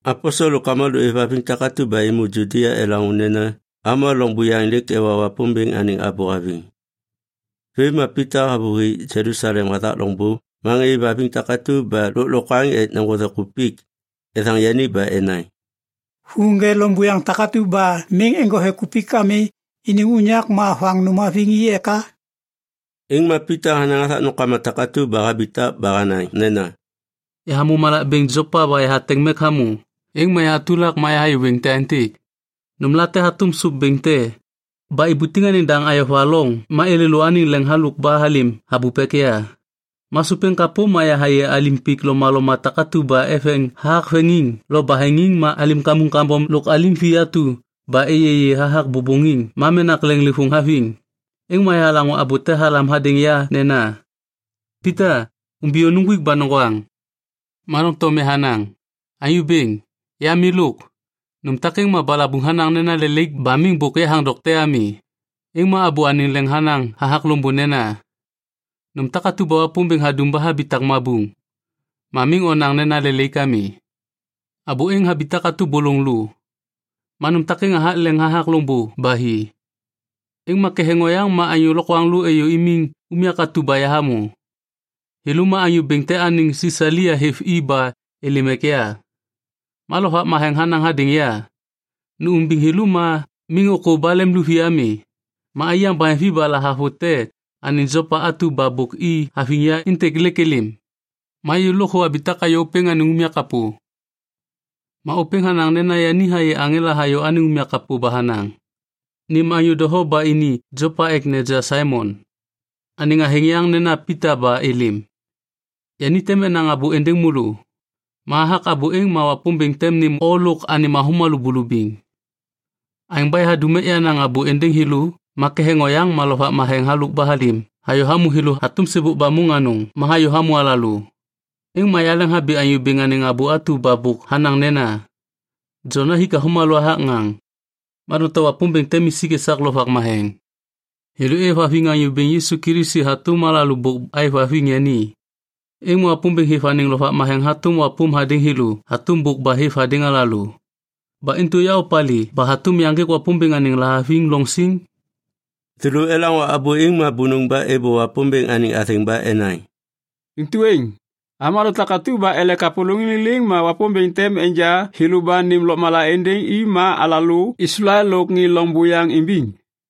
Aposel lôk avômalô êvhaviŋ takatu ba êmô Judia elaŋô nena avômalô loŋ buyaŋ lêk ewa Wapômbêŋ anêŋ abô haviŋ. Vêm ma Pita havôhi Jelusalem hathak loŋbô ma ŋê êvhaviŋ takatu ba lôklokwaŋ ek neŋgothe kupik, ethaŋ yani ba enaŋ, “Hu ŋê loŋ buyaŋ takatu ba miŋ eŋgothe kupik ami iniŋ unyak ma hoaŋ nôm haviŋ i eka?” Êŋ ma Pita hanaŋ hathak nômkama takatu ba habitak ba hanaŋ nena, “Yahamô malak bêŋ Jopa ba yahateŋ mek hamô, êŋ ma yahatulak ma yahayê wêŋ te aêntêk. Nômlate hatôm sôp bêŋ te ba ibutiŋ anêŋ daŋ ayova loŋ ma êlêlô anêŋ leŋ halôk ba halêm habup ek ya. Ma sôp êŋ kapô ma yahayê alim pik lomaloma takatu ba eveŋ hathak veŋiŋ lo baheŋiŋ ma alim kamuŋ kambom lôk alim vi atu ba êyêyê hathak bôbôŋiŋ ma menak leŋlêvôŋ haviŋ. Êŋ ma yahalaŋô abô te halam hadêŋ ya nena, ‘Pita, umbiyô, nuŋgwik ba noŋgwaŋ.’ “Ma doŋtom yahanaŋ, ‘Anyô Bêŋ, ya milôk. Nôm takêŋ ma balabuŋ hanaŋ nena lelaik ba miŋ bôk yahaŋ dokte ami.’ “Êŋ ma abô anêŋ leŋ hanaŋ hathak loŋbô nena, ‘Nôm takatu ba Wapômbêŋ hadum ba habitak mabuŋ, ma miŋ onaŋ nena lelaik ami.’ Abô êŋ habitak hatôm bôlôŋ lô. Ma nôm takêŋ hathak leŋ hathak loŋbô ba hi. “Êŋ ma ketheŋ oyaŋ ma anyô lokwaŋlô êyô imiŋ unyak atu ba yahamô. Thêlô ma anyô bêŋ te anêŋ Sisalia hêv i ba êlêm ek ya. Ma Lovak Matheŋ hanaŋ hadêŋ ya, ‘Nu umbiŋ thêlô ma miŋ ôkô ba lemluvi ami.’ Ma aiyaŋ baheŋvi ba lahavute anêŋ Jopa atu ba bôk i haviŋ ya êntêk lêk êlêm. Ma yêlô lôkthô abitak ayô ôpêŋ anêŋ unyak kapô. Ma ôpêŋ hanaŋ nena yani hayê aŋela hayô anêŋ unyak kapô ba hanaŋ, ‘Nêm anyô doho ba ini Jopa ek neja Saimon, anêŋ athêŋ yaŋ nena Pita ba êlêm. Yani tem enaŋ abô êndêŋ môlô. Ma hathak abô êŋ ma Wapômbêŋ tem nêm o lôk anêm avômalô bulubiŋ.’ “Aêŋ ba yahadum ek yanaŋ abô êndêŋ thêlô ma ketheŋ oyaŋ ma Lovak Matheŋ halôk ba halêm hayô hamô thêlô hatôm sêbôk ba môŋ anôŋ ma hayô hamô alalô. Êŋ ma yaleŋhabi Anyô Bêŋ anêŋ abô atu ba bôk hanaŋ nena, ‘Jon hathik avômalô hathak ŋaŋ, ma doŋtom Wapômbêŋ tem isik esak Lovak Matheŋ.’ Thêlô êvhaviŋ Anyô Bêŋ Yisu Kilisi hatôm alalô bôk aêvhaviŋ yani. Êŋ ma Wapômbêŋ hêv anêŋ Lovak Matheŋ hatôm wapôm hadêŋ thêlô hatôm bôk ba hêv hadêŋ alalô. Ba intu ya opalê ba hatôm yaŋgêk Wapômbêŋ anêŋ lahaviŋ loŋ siŋ?” Thêlô elaŋô abô êŋ ma bônôŋ ba êbô Wapômbêŋ anêŋ athêŋ ba enaŋ, “Intu êŋ, avômalô takatu ba ele kapôlôŋiŋ liliŋ ma Wapômbêŋ tem enja thêlô ba nêm lôkmala êndêŋ i ma alalô Islael lôk ŋê loŋ buyaŋ imbiŋ.”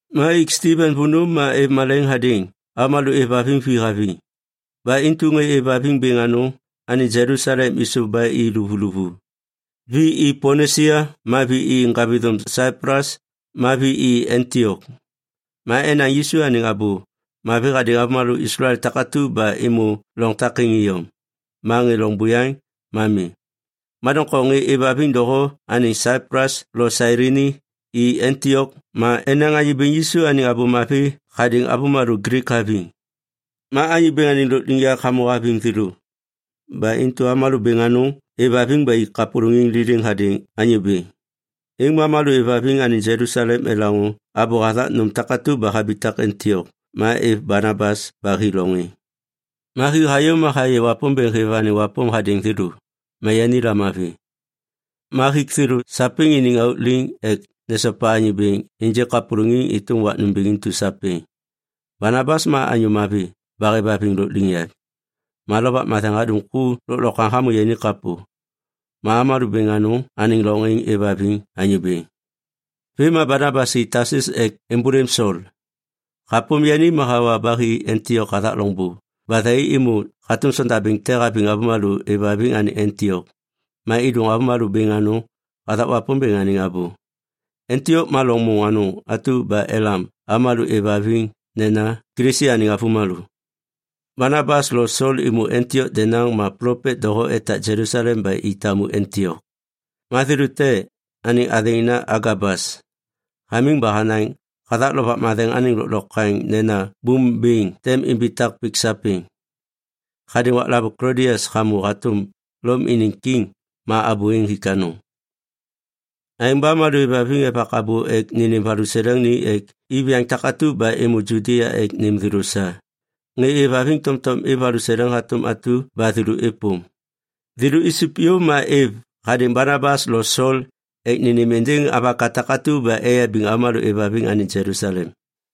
Ma ik Stiven vônô ma êv malaiŋ hadêŋ avômalô êvhaviŋ vi haviŋ. Ba intu ŋê êvhaviŋ bêŋ anôŋ anêŋ Jelusalem êsôv ba i luvuluvu. Vi i Ponisia ma vi i ŋgavithôm Saiplus ma vi i Antiok. Ma enaŋ Yisu anêŋ Abô Mavi hadêŋ avômalô Islael takatu ba êmô loŋ takêŋ iyom, ma ŋê loŋ buyaŋ ma mi. Ma doŋtom ŋê êvhaviŋ doho anêŋ Saiplus lo Sailini, i Antiok ma enaŋ Anyô Bêŋ Yisu anêŋ Abô Mavi hadêŋ avômalô Glik haviŋ. Ma Anyô Bêŋ anêŋ lôkliŋyak hamô haviŋ thêlô. Ba intu avômalô bêŋ anôŋ êvhaviŋ ba ik kapôlôŋiŋ liliŋ hadêŋ Anyô Bêŋ. Êŋ ma avômalô êvhaviŋ anêŋ Jelusalem elaŋô abô hathak nôm takatu ba habitak Antiok ma êv Banabas ba hi loŋ êŋ. Ma hi hayô ma hayê Wapômbêŋ hêv anêŋ wapôm hadêŋ thêlô, ma yani lamavi. Ma hik thêlô sapêŋ iniŋ auk liŋ ek nesopa Anyô Bêŋ ênjêk kapôlôŋiŋ êtôm wak nômbêŋ intu sapêŋ. Banabas ma anyô mavi ba hêvhaviŋ lôkliŋyak. Ma Lovak Matheŋ hadum ku lôklokwaŋ hamô yani kapô. Ma avômalô bêŋ anôŋ anêŋ loŋ êŋ êvhaviŋ Anyô Bêŋ. Vêm ma Banabas hi Tasus ek êmbôlêm Sol. Hapôm yani ma hawa ba hi Antiok hathak loŋbô ba thai êmô hatôm sondabêŋ te haviŋ avômalô êvhaviŋ anêŋ Antiok ma êdôŋ avômalô bêŋ anôŋ hathak Wapômbêŋ anêŋ abô. Antiok ma loŋ môŋ anôŋ atu ba elam avômalô êvhaviŋ nena Kilisi anêŋ avômalô. Banabas lo Sol êmô Antiok denaŋ ma plopet doho etak Jelusalem ba i tamu Antiok. Ma thêlô te, anêŋ athêŋ nena Agabas, hamiŋ ba hanaŋ hathak Lovak Matheŋ anêŋ lôklokwaŋ nena bôm bêŋ tem imbitak pik sapêŋ. (Hadêŋ waklavôŋ Klodias hamô hatôm Lom iniŋ kiŋ ma abô êŋ hik anôŋ.) Aêŋ ba avômalô êvhaviŋ evak abô ek nênêm valuseleŋ ni ek iviyaŋ takatu ba êmô Judia ek nêm thêlô sa. Ŋê êvhaviŋ tomtom êv valuseleŋ hatôm atu ba thêlô êpôm. Thêlô isup yôv ma êv hadêŋ Banabas lo Sol ek nênêm êndêŋ avaka takatu ba eyabiŋ avômalô êvhaviŋ anêŋ Jelusalem.